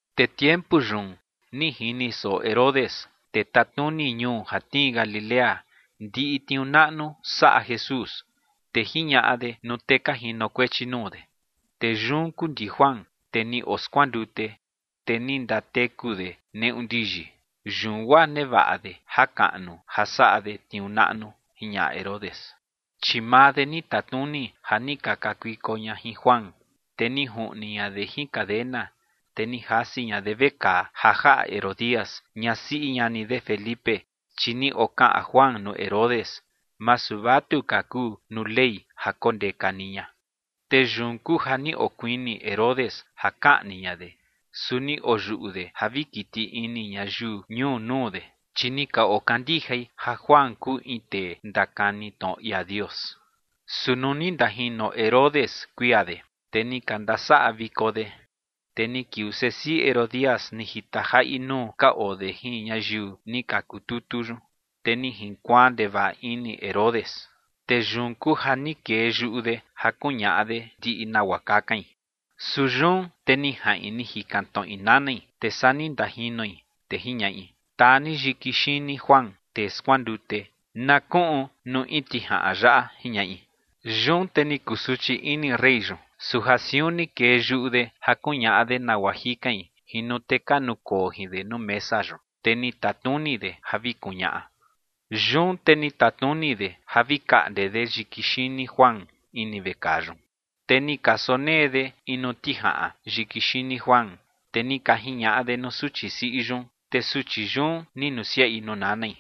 Te tiempu yun ni jini soꞌo Herodes, tee tatnuni ñuu ja tnii Galilea, ndiꞌi tniuu naꞌnu saꞌa Jesús. Te jiñaꞌa de nuu tee ka jinokuechi nuu de: ͏―͏Tee yun kuu ndi Juan, tee ni oskuandute, te ni ndateku de neꞌu ndiyi, yun guaa nevaꞌa de jakaꞌnu ja saꞌa de tniuu naꞌnu ͏―͏jiñaꞌa Herodes. Chi maa de ni tatnuni ja ni ka kakuiko ña jin Juan, te ni juꞌni ña de jin cadena, te ni jasi ña de vekaa ja jaꞌa Herodías, ñasiꞌi ñani de Felipe. Chi ni okaꞌan Juan nuu Herodes: ͏―͏Masu vatuka kuu nuu Ley ja kondeka ni ña. Te yun kuu ja ni okuini Herodes ja kaꞌni ña de, su ni oyuꞌu de ja vi kiti ini ñayiu ñuu nuu de, chi ni ka okandijai ja Juan kuu in tee ndakani tnoꞌo ia Dios. Su nuu ni ndajino Herodes kuia de, te ni ka ndasaꞌa viko de, te ni kiuu sesiꞌi Herodías ni jita jaꞌi nuu ka oo de jin ñayiu ni ka kututu yun, te ni jinkuaan ndevaꞌa ini Herodes. Te yun kuu ja ni kee yuꞌu de ja kuñaꞌa de ndiꞌi nagua kakain. Su yun te ni jaꞌin ni jikan tnoꞌi nanai, te saa ni ndajinoi, te jiñaꞌi: ͏―͏Taa ni yiki xini Juan, tee skuandute, na kuꞌun nuu in tijaꞌan yaꞌa ͏―͏jiñaꞌi. Yun te ni kusuchi ini rey yun, su ja siun ni kee yuꞌu de ja kuñaꞌa de nagua jikain jin nuu tee ka nukoo jin de nuu mesa yun, te ni tatnuni de ja vi kuñaꞌa. Yun te ni tatnuni de ja vi kaꞌnde de yiki xini Juan ini vekaa yun. Te ni ka sonee de in nuu tijaꞌan yiki xini Juan, te ni ka jiñaꞌa de nuu suchi siꞌi yun, te suchi yun ni nusiaꞌi nuu nanai.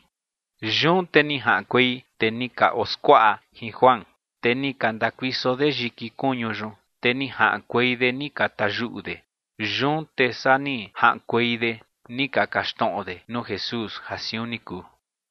Yun te ni jaꞌankuei tee ni ka oskuaꞌa jin Juan, te ni ka ndakuiso de yiki kuñu yun, te ni jaꞌankuei de ni ka tayuꞌu de. Yun te saa ni jaꞌankuei de ni ka kaxtnoꞌo de nuu Jesús ja siun ni kuu.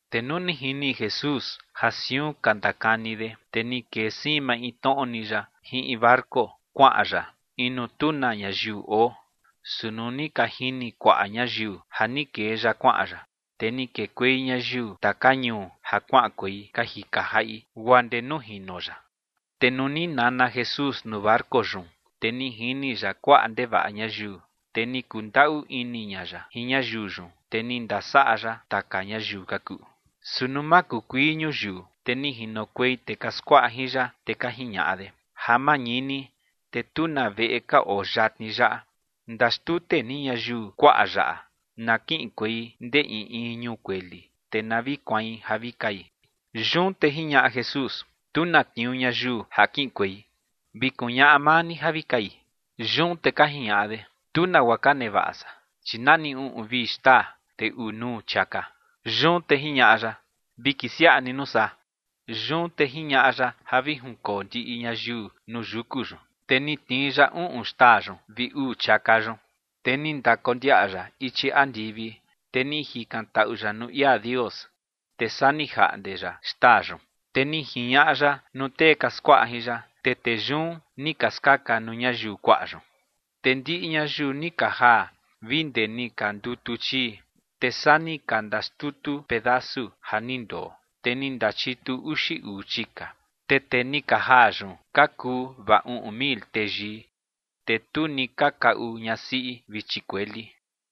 Te nuu ni jini Jesús ja siun ka ndakani de, te ni kee siin maintnoꞌo ni ya jin in barco kuaꞌan ya in nuu tu na ñayiu oo. Su nuu ni ka jini kuaꞌa ñayiu ja ni kee ya kuaꞌan ya, te ni kekuei ñayiu taka ñuu ja kuaꞌankuei ka jika jaꞌi guaa ndee nuu jino ya. Te nuu ni nana Jesús nuu barco yun, te ni jini ya kuaꞌa ndevaꞌa ñayiu, te ni kundaꞌu ini ña ya jin ñayiu yun, te ni ndasaꞌa ya taka ñayiu ka kuꞌu. Su nuu makukuii ñuyiu, te ni jinokuei tee ka skuaꞌa jin ya, te ka jiñaꞌa de: ͏―͏Ja mañini, te tu na veꞌe ka oo yatni yaꞌa. Ndaxtute ni ñayiu kuaꞌa yaꞌa, na kiꞌinkuei ndee in in ñuu kueli, te na vi kuain ja vi kai. Yun te jiñaꞌa Jesús: ͏―͏Tu na tniuu ñayiu ja kiꞌinkuei. Vi kuñaꞌa maa ni ja vi kai. Yun te ka jiñaꞌa de: ͏―͏Tu nagua ka nevaꞌa san, chi nani uꞌun vi xtaa, te uu nuu chiaka. Yun te jiñaꞌa ya: ͏―͏Vi kisiaꞌa ni nuu saa. Yun te jiñaꞌa ya ja vi junkoo ndiꞌi ñayiu nuu yuku yun. Te ni tnii ya uꞌun xtaa yun vi uu chiaka yun, te ni ndakondiaꞌa ya ichi andivi, te ni jikantaꞌu ya nuu ia Dios, te saa ni jaꞌnde ya xtaa yun. Te ni jiñaꞌa ya nuu tee ka skuaꞌa jin ya, te tee yun ni ka skaka nuu ñayiu kuaꞌa yun. Te ndiꞌi ñayiu ni ka jaa vi ndee ni ka ndutu chii. Te saa ni ka ndaxtutu pedasu ja ni ndoo, te ni ndachitu uxi uu chika. Te tee ni ka jaa yun ka kuu vaa uꞌun mil teyii, te tu ni ka kaꞌu ñasiꞌi vi chikueli.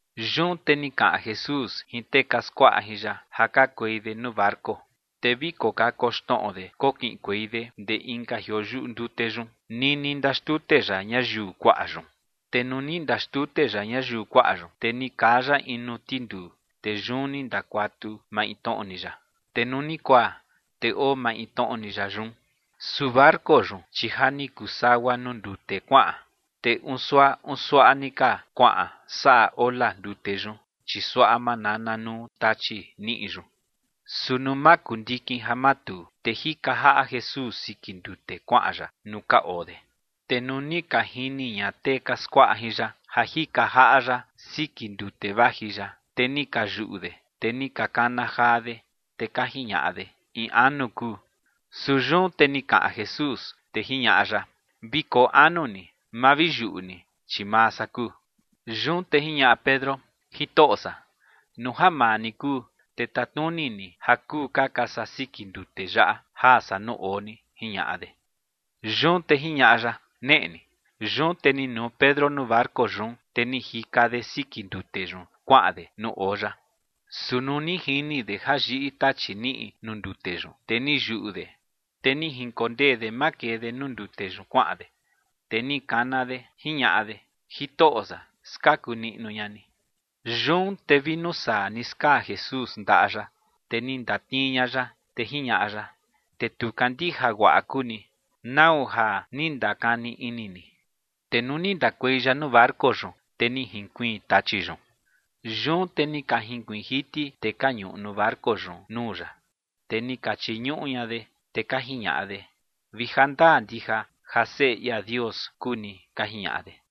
Yun te ni kaꞌan Jesús jin tee ka skuaꞌa jin ya ja kakuei de nuu barco, te vi kokakoxnoꞌo de kokiꞌinkuei de ndee inka jioo yuꞌu ndute yun nini ndaxtute ya ñayiu kuaꞌa yun. Te nuu ni ndaxtute ya ñayiu kuaꞌa yun, te ni kaa ya in nuu tinduu, te yun ni ndakuatu maintnoꞌo ni ya. Te nuu ni kuaa, te oo maintnoꞌo ni ya yun. Su barco yun, chi ja ni kuu sagua nuu ndute kuaꞌan, te uun suaꞌa uun suaꞌa ni ka kuaꞌan saꞌa ola ndute yun, chi suaꞌa manana nuu tachi niꞌi yun. Su nuu makundikin ja matuu, te jika jaꞌa Jesús siki ndute kuaꞌan ya nuu ka oo de. Te nuu ni ka jini ña tee ka skuaꞌa jin ya ja jika jaꞌa ya siki ndute vaji ya, te ni ka yuꞌu de, te ni ka kana jaa de, te ka jiñaꞌa de: ͏―͏¡In anu kuu! Su yun te ni kaꞌan Jesús, te jiñaꞌa ya: ͏―͏Vi koo anu ni, ma vi yuꞌu ni, chi maa san kuu. Yun te jiñaꞌa Pedro: ͏―͏Jitoꞌo san, nuu ja maa ni kuu, te tatnuni ni ja kuu kaka san siki ndute yaꞌa jaa san nuu oo ni ͏―͏jiñaꞌa de. Yun te jiñaꞌa ya: ͏―͏Neꞌe ni. Yun te ni nuu Pedro nuu barco yun, te ni jika de siki ndute yun kuaꞌan de nuu oo ya. Su nuu ni jini de ja yiꞌi tachi niꞌi nuu ndute yun, te ni yuꞌu de. Te ni jinkondee de makee de nuu ndute yun kuaꞌan de. Te ni kana de, jiñaꞌa de: ͏―͏Jitoꞌo san, ¡skaku niꞌnu ña ni! Yun te vi nuu saa ni skaa Jesús ndaꞌa ya, te ni ndatnii ña ya, te jiñaꞌa ya: ͏―͏Tee tu kandija guaꞌa kuu ni. ¿Nau ja ni ndakani ini ni? Te nuu ni ndakuei ya nuu barco yun, te ni jinkuiin tachi yun. Yun te ni ka jinkuiin jiti tee ka ñuꞌu nuu barco yun nuu ya, te ni ka chiñuꞌu ña de, te ka jiñaꞌa de: ͏―͏Vi ja ndaa ndija ja Seꞌe ia Dios kuu ni ͏―͏ka jiñaꞌa de.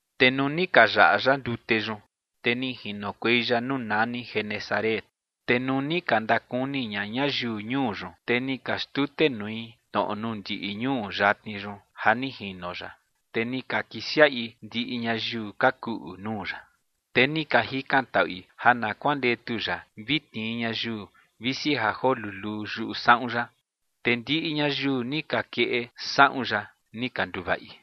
Te nuu ni ka yaꞌa ya ndute yun, te ni jinokuei ya nuu nani Genesaret. Te nuu ni ka ndakuni ña ñayiu ñuu yun, te ni ka xtutenui tnoꞌo nuu ndiꞌi ñuu yatni yun ja ni jino ya, te ni ka kisiaꞌi ndiꞌi ñayiu ka kuꞌu nuu ya. Te ni ka jikantaꞌui ja na kuandetu ya vi tnii ñayiu, visi ja joo luluu, yuꞌu saꞌun ya. Te ndiꞌi ñayiu ni ka keꞌe saꞌun ya ni ka nduvaꞌi.